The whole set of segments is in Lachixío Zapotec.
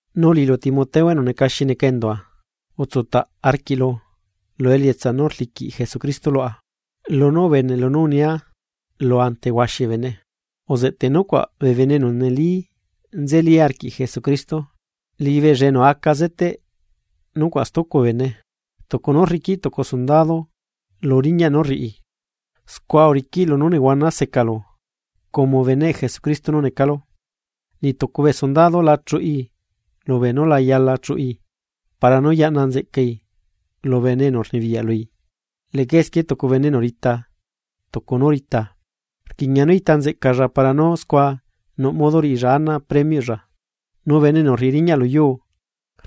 Nu liꞌilu Timoteo enu neca xi neca endua, utsutaꞌ arquiꞌlu lu elietsa nú rliqui Jesucristo luaꞌa. Lunú ubeneꞌlu nú unia lulu ante huaxi bee bene, uzeꞌteꞌ nucuaꞌ bee bene enu neli nzeli arquiꞌ Jesucristo, liꞌibeella enu aca zeteꞌ nucuaꞌ stucu bee bene. Tucu nú rriquiꞌ tucu sondado lu riñaꞌ nú rriꞌi, scua uriquiꞌ lunú nehuana secalu como beneꞌ Jesucristo nú necalu. Niꞌ tucu bee sundado la chuꞌi lubee nú la yala chuꞌi, para nú yaꞌna nzeꞌcai lu bene enu rnibiyaꞌ lui. Leꞌca esquie tucu bene enu rita tucu nú rita, rquiꞌña nú ita nzeꞌcalla para nú scua nuꞌ modo riꞌilla ana premioꞌlla. Nu bene enu rriꞌi riñaꞌ lu yuu,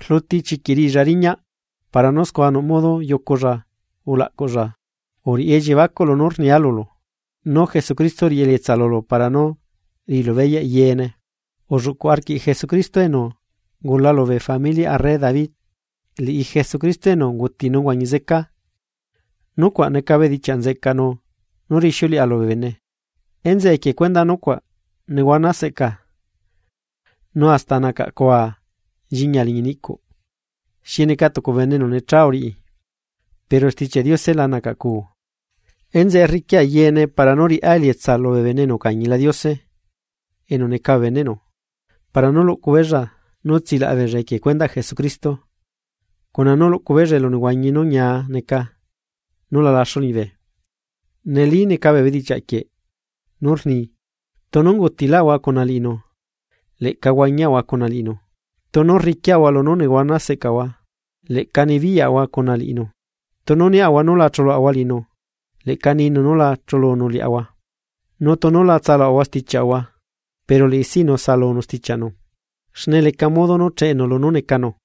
rluti chiquiꞌ riꞌilla riñaꞌ para nú scua nuꞌ modo yuculla ulaꞌcuꞌlla. Uriꞌi elliebacuꞌ lunú rnia lulu, nu Jesucristo riꞌi elietsa lulu para nú riꞌilu beyaꞌ yeene. Ulluꞌcuꞌ arquiꞌ Jesucristo enu ungula lubee familiaꞌ arre David, liꞌi Jesucristo enu unguti nu uhuañi zeca, nucuaꞌ neca bedichiaꞌ nzeꞌcaꞌnu nú rixiuleꞌa lubee bene. Enzeꞌe equie cuendaꞌ nucuaꞌ nehuana seꞌca nu hasta nacaꞌcua nchiñia liñi niꞌcuꞌ, xi neca tucu bene enu necha uriꞌi, pero Stichiaꞌ Diose la nacaꞌcuu. Enzeꞌe rriquia yeene para nú riꞌá elietsa lubee bene enu ucañila Diose enu neca bee beneꞌnu, para nú luꞌcu beella nú tsilaꞌa beella equie cuendaꞌ Jesucristo, cuna nú luꞌcu beella elunehuañi nú ñia neca nú la laxu liñibe. Neli neca bee bedichiaꞌ quieꞌ nú rni: Tunu ungutilaꞌahua cuna liꞌinu, leꞌca huañiaꞌahua cuna liꞌinu. Tunu rriquiꞌahua lunú nehuana seꞌcaꞌahua, leꞌca nibiyaꞌahua cuna liꞌinu. Nu tunu niaꞌahua nú la chuluꞌahua liꞌinu, leꞌca ninu nú la chulunu liaꞌahua. Nu tunu la tsaluꞌahua stichiaꞌahua, pero liꞌi sino saꞌalunu stichiaꞌnu. Xne leca modo nú cheꞌenu lunú necanu.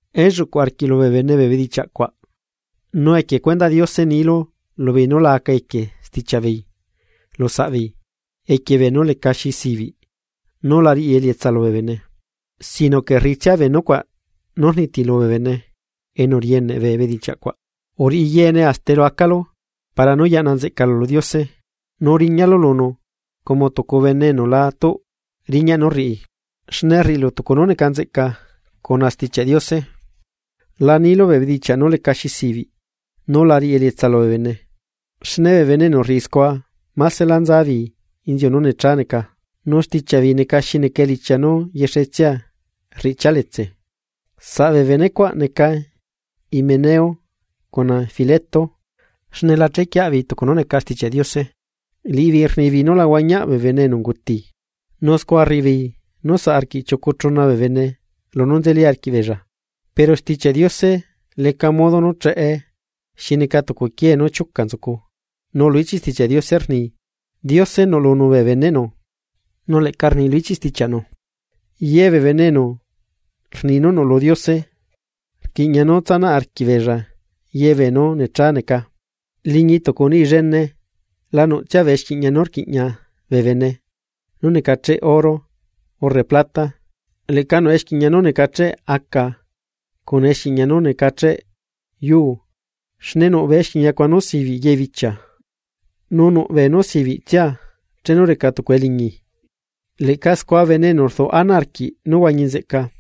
Elluꞌcuꞌ arquiꞌlu bee bene bee bedichiaꞌ cuaꞌ, nu equie cuendaꞌ Diose nilu lubeei nú la aca equie stichiaꞌ beei lu saꞌbeei equie beenú lecaxi sibiꞌ nú la riꞌi elietsa lubee bene, sino que rriꞌitsia bee nucuaꞌ nú rnitilu bee bene enu rieneꞌ bee bedichiaꞌ cuaꞌ. Uriꞌi yeene hasta elu acalu para nú yaꞌna nzeꞌcalu lu Diose, nu riñalu lunu como tucu bene enu la tuꞌ riñaꞌ nú rriꞌi, xne rriꞌilu tucu nú neca nzeꞌca cuna Stichiaꞌ Diose. La nilu bee bedichiaꞌ nú lecaxi sibiꞌ, nú la riꞌi elietsa lubee bene. Xne bee bene enu rriꞌi scua másela nzabeei inziu nú necha neca, nu stichiaꞌ beei neca xi neca elichia nú yexetsia rriꞌchia letse. Saꞌ bee bene cuaꞌ neca Himeneo cuna Fileto, xne la chequieaꞌ beei tucu nú neca Stichiaꞌ Diose. Liꞌibeei rnibeei nú la huañiaꞌ bee bene enu unguti, nu scua rriꞌibeei nú saꞌ arquiꞌ chiucu chuna bee bene lunú nzeli arquiꞌbeella. Pero Stichiaꞌ Diose leca modo nú cheꞌe xi neca tucu quiee nú chiuca nzucu. Nu lu ichiꞌ Stichiaꞌ Diose rni: “Diose nuꞌlunu bee beneꞌnu”, nu leꞌca rni lu ichiꞌ stichiaꞌnu: “Ye bee bene enu rni nú nuꞌlu Diose, rquiꞌña nú tsanaꞌ arquiꞌbeella ye beenu necha neca.” Liñi tucu niꞌi llene la nuꞌtsia bee exquiꞌñia nú rquiꞌña bee bene nú necacheꞌ oro urre plata, leꞌca nuꞌ exquiꞌña nú necacheꞌ aca cuna exquiꞌña nú necacheꞌ yuu, xne nuꞌ bee exquiꞌña cuaꞌ nú sibiꞌi ye bichia, nu nuꞌ beenú sibiꞌtsia chenu reca tucu eliñi. Leꞌca scua bene enu duꞌ ana arquiꞌ nú huañi nzeꞌca,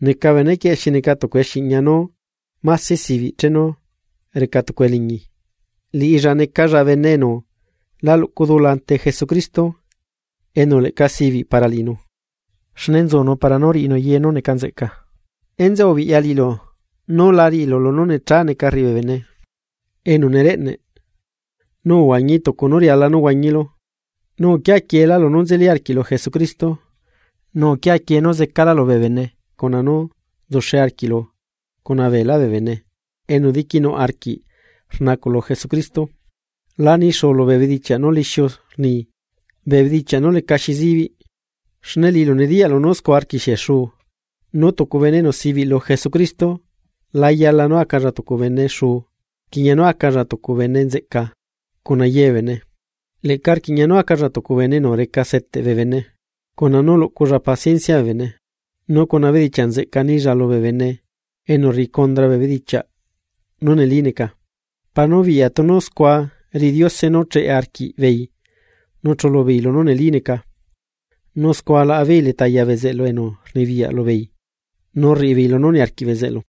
neca benequieꞌ xi neca tucu exquiꞌña nú máse sibiꞌ chenu reca tucu eliñi. Liꞌilla necalalla bene enu la luꞌcu dula ante Jesucristo enu leꞌca sibiꞌ para liꞌinu, xne nzunu para nú riꞌinu ye nú neca nzeꞌca. Enzeꞌe ubiꞌya liꞌilu nú lá riꞌilu lunú necha neca rriꞌi bee bene enu nereꞌneꞌ, nu uhuañi tucu nu riala nú huañilu. Nu uquia quieelá lunú nzeli arquiꞌlu Jesucristo, nu uquia quie nú zecalálu bee bene cuna nú nzuxe arquiꞌlu cuna beelá bee bene enu diquinuꞌ arquiꞌ rnacuꞌ lu Jesucristo. La nixuulu bee bedichiaꞌ nú lixiu rni, bee bedichiaꞌ nú lecaxi zibiꞌ, xne liꞌilu nediyaꞌlu nú scua rquixie xuu. Nu tucu bene enu sibiꞌ lu Jesucristo la yala nú acalla tucu bene xuu, rquiꞌña nú acalla tucu bene nzeꞌca cuna ye bee bene, leꞌca rquiꞌña nú acalla tucu bene enu reca seteꞌ bee bene, cuna nú luꞌculla paciencia bee bene, nu cuna bedichiaꞌ nzeꞌca nilla lubee bene enu rriꞌi condra bee bedichiaꞌ nu neli neca, para nú biꞌya tunu scua riꞌi Diose nú cheꞌe arquiꞌbeei nu chulu beei lunú neli neca, nu scua laꞌa beei leta ya bezeꞌlu enu rnibiyaꞌ lubeei nu rriꞌi beei lunú niarquiꞌ bezeꞌlu.